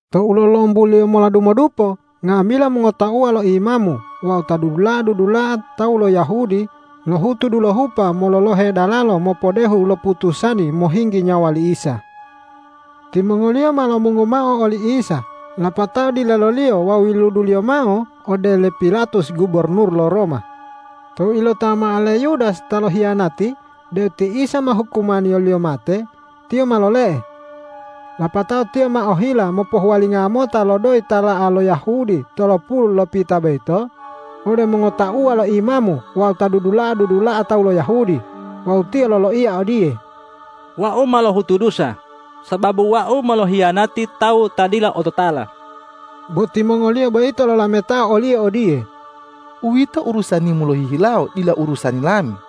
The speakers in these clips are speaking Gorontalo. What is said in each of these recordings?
Tou lolombuliyo mola dumodupo nga'amila mongotauwa lo imamu wawu ta dudula'a-dudula'a tawu lo Yahudi lohutu dulohupa mololohe dalalo mopodehu loputusani mohinggi nyawa li Isa. Timongoliyo ma lomungu mao oli Isa, lapatao dileloliyo wawu yiluduliyo mao ode le Pilatus gubornur lo Roma. Tou ilotawa mao le Yudas ta lohiyanati deu ti Isa ma hukumaniyoliyo mate, tiyo ma lole'e. Lapatao tiyo ma ohila mopohuwalinga mota lo doyi tala'a lo Yahudi tolopulu lopita boyito ode mongotauwa lo imamu wawu ta dudula'a-dudula'a tawu lo Yahudi. Wawu tiyo loloiya odiye,”Wau ma lohutu dusa, sababu wau ma lohiyanati tawu ta dila ototala.” Bo timongoliyo boyito lolametao oliyo odiye,”Uwito urusanimu lohihilawo, dila urusani lami!”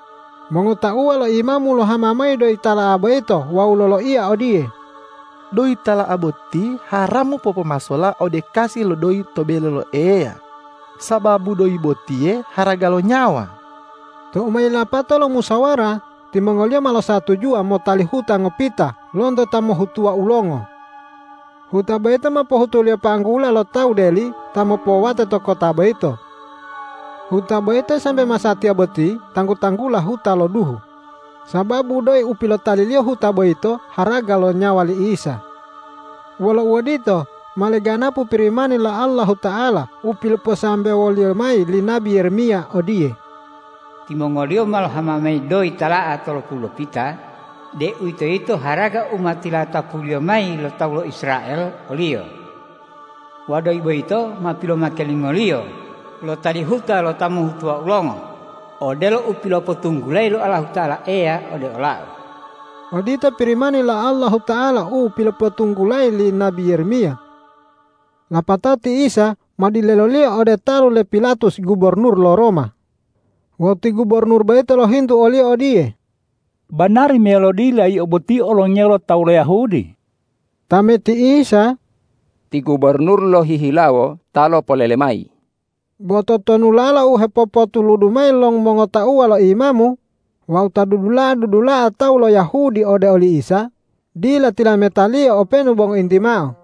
Mongotauwa lo imamu lohama mayi doyi tala'a boyito wawu loloiya odiye,”Doyi tala'a boti haramu popomasola ode kasi lo doyi to bele lo Eya, sababu doyi botiye haraga lo nyawa.” Tou ma yilapato lo musawara, timongoliyo ma losatujuwa motali huta ngopita lonto ta mohhutuwa ulongo. Huta boyito ma pohutuliyo panggula lo tawu deli ta mopowate to kota boyito. Huta boyito sambe masatiya boti tanggu-tanggula Huta lo Duhu, sababu doyi u pilotaliliyo huta boyito haraga lo nyawa li Isa. Wolo uodito, ma leganapu Pirimani lo Allahuta'ala u piloposambewoliyo mayi li nabi Yeremiya odiye,”Timongoliyo ma lohama mayi doyi tala'a tolopulu lopita, deuwitoyito haraga u ma tilatapuliyo mayi lo tawu lo Israel oliyo. Wawu doyi boyito ma pilomake limongoliyo lotali huta lo ta mohhutuwa ulongo odelo u pilopotunggulayi lo Allahuta'ala Eya ode olau.” Odito Pirimani lo Allahuta'ala u pilopotunggulayi li nabi Yeremiya. Lapatao ti Isa ma dileloliyo ode talu le Pilatus gubornur lo Roma. Wawu ti gubornur boyito lohintu o-Liyo odiye,”Banari meyalo dila Yio boti olongiya lo tawu lo Yahudi?” Tameti Isa,”Ti gubornur lohihilawo ta lopolele mayi.” Bo totonulala u hepopotuludu mayi lo mongotauwa lo imamu wawu ta dudula'a-dudula'a tawu lo Yahudi ode oli Isa, dila tilameta-Liyo openu bo ngointi mao.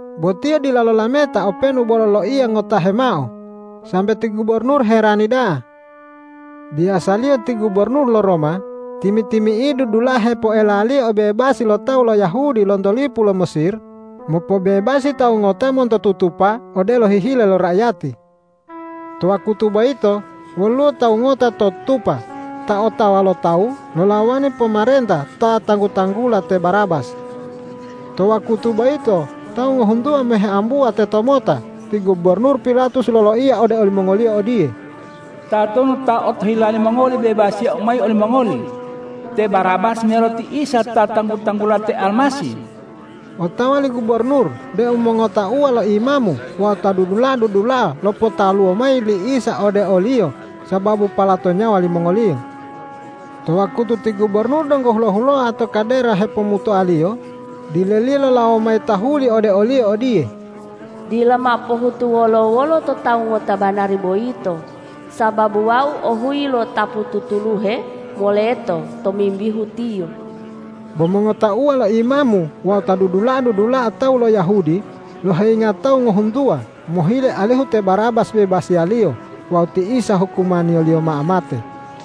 Bo Tiyo dila lolameta openu bo loloiya ngotahe mao, sambe ti gubornur herani da'a. Biyasaliyo ti gubornur lo Roma timi-timi'idu dulahe poelaliyo obebasi lo tawu lo Yahudi lonto lipu lo Mesir, mopobebasi tawu ngota monto tutupa odelo hihile lo raiyati. To wakutu boyito woluwo tawu ngota to tutupa ta otawa lo tawu lolawani pomarenta ta tanggu-tanggula te Barabas. To wakutu boyito tawu ngohuntuwa ma heambuwa tetomota ti gubornur Pilatus loloiya ode olimongoliyo odiye,”Tatonu ta otohila limongoli bebasiyau mayi olimongoli, te Barabas meyalo ti Isa ta tanggu-tanggula te Almasih?” Otawa li gubornur deu mongotauwa lo imamu wawu ta dudula'a-dudula'a lopotaluwo mayi li Isa ode o-Liyo sababu palato nyawa limongoliyo. To wakutu ti gubornur donggo hulo-huloa to kadera hepomutoaliyo dileliyo lolawo mayi tahuli ode oliyo odiye,”Dila mao pohutu wolo-wolo to Tawu ngota banari boyito, sababu wau ohuyi lo'otapu tutuluhe moleto tomimbihu Tiyo.” Bo mongotauwa lo imamu wawu ta dudula'a-dudula'a tawu lo Yahudi loheyinga tawu ngohuntuwa mohile alihu te Barabas bebasiyaliyo wawu ti Isa hukumaniyoliyo mao mate.